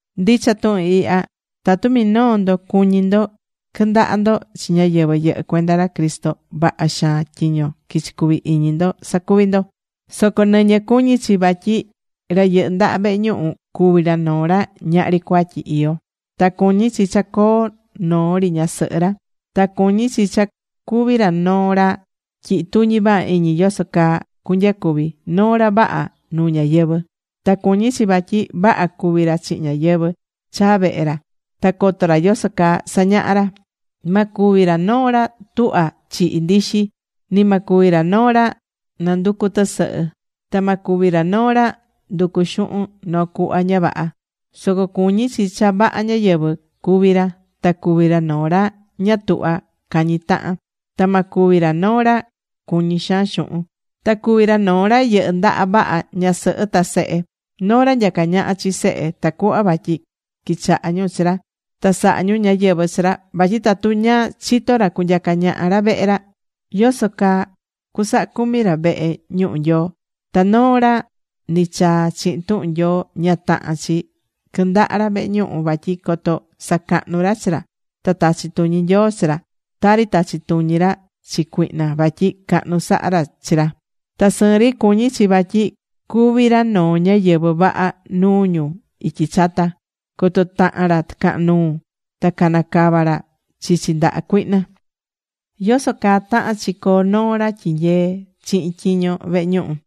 Ndicha tuhun ihya: Tatu minoo ndo cuñí ndo quɨndaha ndo chi ñáyɨvɨ yɨhɨ́ cuenda ra Cristo, vaha xaan tyiño quichí cuvi iñi ndo sacuvi ndo. Soco nɨñɨ cuñí chi vatyi ra yɨhɨ́ ndaha vehe ñuhu cuvi ra noo ra ñahri cuatyi iyó. Ta cuñí chi cha coo noo ri ñasɨhɨ ra. Ta cuñí chi cha cuvi ra noo ra tyihi tuñi vaha iñi yoso caa cunyacuvi, noo ra vaha nuu ñáyɨvɨ. Ta cuñí chi vatyi vaha cuví ra chihin ñáyɨvɨ chaa vehe ra. Ta coto ra yoso caa sañahá ra. Ma cuvi ra noo ra tuhvá chihi ndixi, ni ma cuvi ra noo ra nanducú tɨsɨhɨ. Ta ma cuvi ra noo ra nducu xuhun noo cuhva ña vaha. Soco cuñí chi cha vaha ñáyɨvɨ cuví ra, ta cu̱vi ra noo ra ña tuhvá cañi tahan. Ta ma cuvi ra noo ra cuñí xaan xuhun. Ta cuvi ra noo ra yɨhɨ́ ndaha vaha ñasɨhɨ ta sehe: Noo ra nyacá ñaha chi sehe tacuhva vatyi quichaha ñu chi ra, ta saha ñu ñáyɨvɨ chi ra. Vatyi tatu ña chitó ra cunyaca ñaha ra vehe ra, ¿yoso caa cusaha cumi ra vehe ñuhu Nyoo? Ta noo ra nichaa chihin tuhun Nyoo ña tahán chi quɨndaha ra vehe ñuhu vatyi coto sacahnu ra chi ra ta tachi tuñi Nyoo chi ra, tari tachi̱ tuñi ra chi cuihna vatyi cahnu sahá ra chi ra. Ta sɨɨn ri cuñí chi vatyi cuví ra noo ñáyɨvɨ vaha nuu ñu ityi chata, coto tahan ra tɨcahan nuu ta cana cava ra chichi ndaha cuihna.Yoso caa tahán chi coo noo ra tyinyee chihin tyiño vehe ñuhu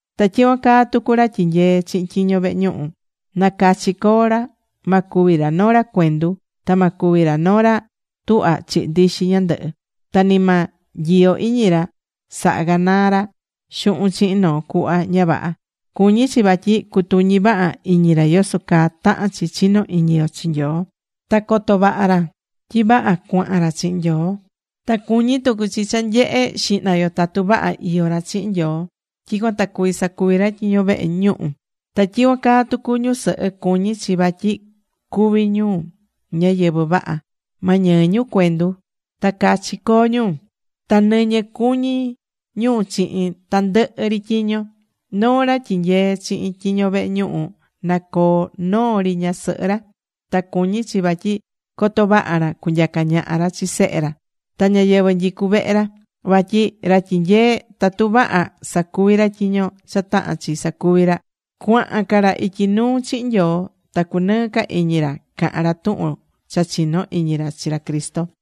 Ta tyicuan caa tucu ra tyinyeé chihin tyiño vehe ñuhu. Na cachi co̱o ra. Ma cuvi ra noo ra cuendu, ta ma cuvi ra noo ra tuhva chihi ndixi ñandɨhɨ. Ta ni ma nyiyo iñi ra saha canaa ra xuhun chihin noo cuhva ña vaha. Cuñí chi vatyi cutuñí vaha iñi ra yoso caa tahán chi chino iñi yo chi Nyoo ta coto vaha ra tyi vaha cuahan ra chihin Nyoo. Ta cuñí tucu chi cha nye̱he xihna yo tatu vaha iyó ra chihin Nyoo tyicuan ta cuví sacuvi ra tyiño vehe ñuhu. Ta tyicuan caa tucu ñusɨhɨ, cuñí chi vatyi cuví ñu ñáyɨvɨ vaha. Ma ñɨɨ ñu cuendu. Ta cachi coo ñu. Ta nɨñɨ cuñí ñu chihin tandɨhɨ ri tyiño. Noo ra tyinyeé chihin tyiño vehe ñuhu na coo noo ri ñasɨhɨ ra. Ta cuñí chi vatyi coto vaha ra cunyaca ñaha ra chi sehe ra ta ñáyɨvɨ nyicú vehe ra. Vatyi ra tyinyeé, tatu vaha sacuvi̱ ra tyiño cha tahán chi sacuvi ra, cuahan ca ra ityi nuu chihin Nyoo. Ta cunɨɨ ca iñi ra cahan ra tuhun cha chinó iñi ra chi ra Cristo.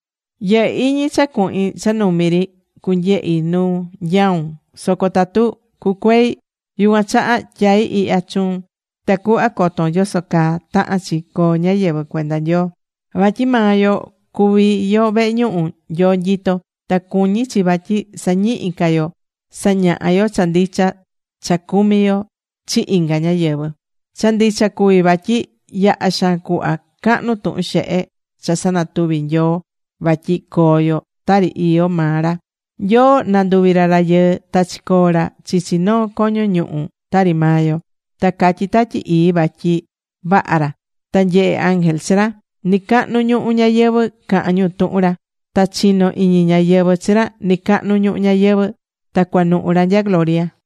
Yɨhɨ́ iñi cha cuhin cha numi ri cunyehi nu nyaún. Soco tatu cucuei, yucuan chaha tyaí ihya chuun tacuhva coton yoso caa tahán chi coo ñáyɨvɨ cuenda Nyoo. Vatyi maa yo cuví yo vehe ñuhu Nyoo nyitó. Ta cuñí chi vatyi sañihi ca yo sañaha yo cha ndicha cha cumí yo chi inga ñáyɨvɨ. Cha ndicha cuví vatyi yaha xaan cuhva cahnu tuhun xehe cha sanatuvi̱ Nyoo, vatyi coo yo tari iyó maa ra: Nyoo nanduvi̱ ra rayɨɨ ta chicoo̱ ra chichi noo coño ñuhu tari maa yo. Ta catyí Tatyi Ii vatyi vaha ra. Ta nyehe̱ ángel chi ra. Nɨcahnu ñuhu ñayɨvɨ̱ cahán ñu tuhun ra. Ta chinó iñi ñáyɨvɨ chi ra nɨcacahnu ñuhu ñayɨvɨ̱. Ta cuanuhu̱ ra nya gloria.